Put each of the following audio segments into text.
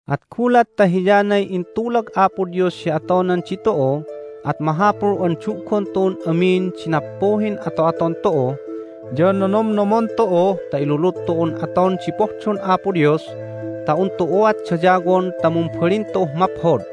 At gulat ta hiyanay intulag Apo Dios hi atonan ditu'u at mahapul an du'gon tu'un amin di nappuhin ato'aton tu'u, ya nonomnomon tu'u ta ilulud tu'un aton di pohdon Apo Dios ta un tu'uat dayawon ta mumbalin tu'uh maphod.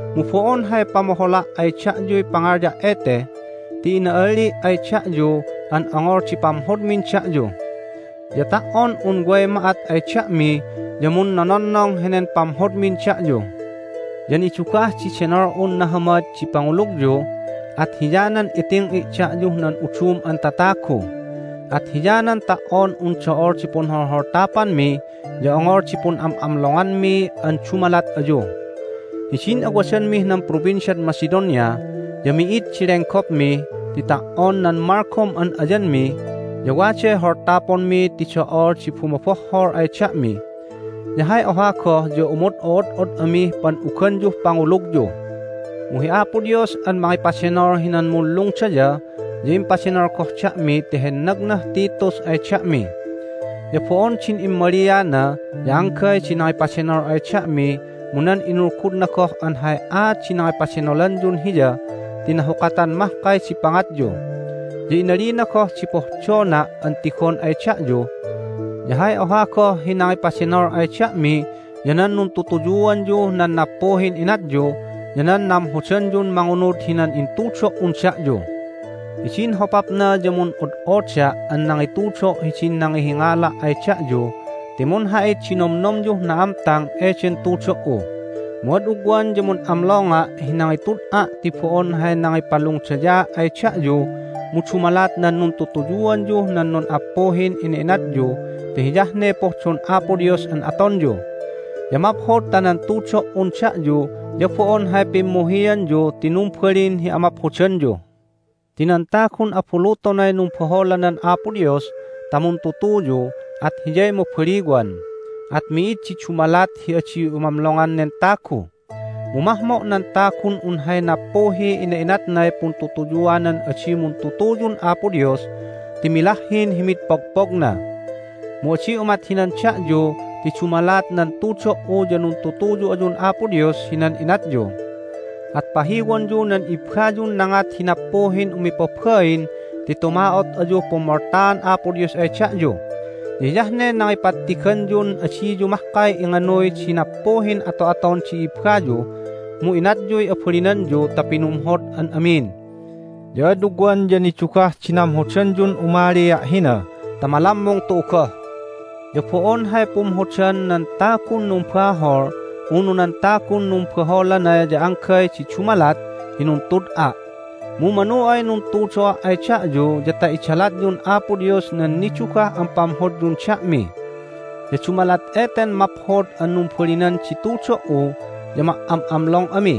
Mu bo'on hay pamohola' ay da'yuy pangalya' ete, ti ina'alli' ay da'yu an ongol di pamhodmin da'yu. Ya ta"on un way ma'at ay da'mi ya munnononnong henen pamhodmin da'yu. Ya nidugah di denol'un nahamad di pangulugyu, at hiyanan iting'i' da'yuh nan udum an tatagu. At hiyanan ta"on un do'ol di punholholtapanmi ya ongol di pun'am'amlonganmi an dumalat ayu. Hidin awadanmih nan Provinciad Macedonia ya mi'id di lenggopmi ti ta"on nan malgom an ayanmi ya waday holtaponmi ti do'ol di bumobohhol ay da'mi, ya hay oha goh ya umod'o'od'od amih pan'uganyuh pangulugyu. Mu hi Apo Dios an mangipadenol hinan munlungdaya ya impadenol goh da'mi ti hennagnah Titus ay da'mi. Ya bo'on din immaliana ya anggay di nangipadenol ay da'mi mu nan inulgudna goh an hay aat di nangipadenolanyun hiya ti nahukatan mahkay di pangatyu. Ya inalina goh di pohdona' an tigon ay da'yu. Ya hay oha goh hi nangipadenol ay da'mi ya nan nuntutuyuanyuh nan nappuhin inatyu ya nan namhodanyun mangunud hinan intudo"un da'yu. Hidin hopapna ya mun'od'oda' an nangitudo' hidin nangihingala' ay da'yu ti munha'it di nomnomyuh na'amtang eden tudo"u, mu ad ugwan ya mun'amlonga' hi nangitud'a' ti bo'on hay nangipalungdayaa' ay da'yu mu dumalat nan nuntutuyuanyuh nan nun'appuhin ina'inatyu ti hiyah ne pohdon Apo Dios an atonyu. Ya maphod ta nan tudo"un da'yu ya bo'on hay pimmuhianyu ti numbalin hi amaphodanyu. Ti nan tagun abulutonay numbaholanan Apo Dios ta muntutuyu at hiyay mabaliwan. At mi'id di dumalat hi adi umamlongan nen tagu. Mu mahmo' nan tagun un hay nappuhiy ina'inatnay puntutuyuanan adi muntutuyun Apo Dios ti milahhin hi mid pogpogna. Mu adi umat hinan da'yu ti dumalat nan tudo"u ya nuntutuyu ayun Apo Dios hinan inatyu. At pahiwonyu nan ibbayun nangat hi nappuhin umipabain ti tuma'ot ayuh pummoltaan Apo Dios ay da'yu. Ya hiyah ne nangipattiganyun adiyu mahkay inganuy di nappuhin ato'aton di i'ibbayu, mu inatyuy abalinanyu ta pinumhod an amin. Ya ad ugwan ya nidugah di namhodanyun umalia' hina ta malammung tu'u goh. Ya bo'on hay pumhodan nan tagun numbahol unu nan tagun numbaholana ya anggay di dumalat hi nuntud'a', mu manu ay nuntudo'a' ay da'yu ya ta idalatyun Apo Dios nan nidugah an pamhodyun da'mi. Ya dumalat eten maphod an numbalinan di tudo"u ya ma"am'amlong ami.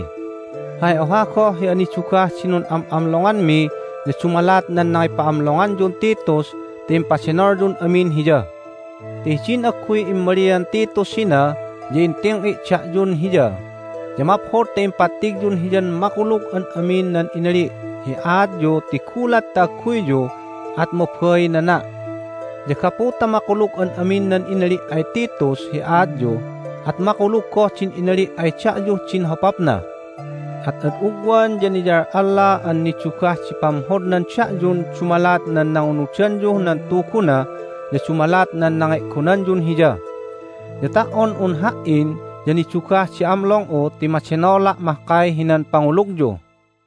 Hay oha goh hi anidugah di nun'am'amlonganmi ya dumalat nan nangipa'amlonganyun Titus ti impadenolyun amin hiya. Ti hidin agguy immalian Titus hina ya inting'i' da'yun hiya, ya maphod ta impattigyun hiyan makulug an amin nan inali' hi aatyu ti gulat ta agguyyu at mabainana'. Ya gapu ta makulug an amin nan inali' ay Titus hi aatyu at makulug goh din inali' ay da'yuh din hopapna. At ad ugwan ya niyal'alla an nidugah di pamhodnan da'yun dumalat nan nangunudanyuh nan tuguna ya dumalat nan nange'gonanyun hiya. Ya ta"on un ha"in ya nidugah di amlong'u ti madenola' mahkay hinan pangulugyu.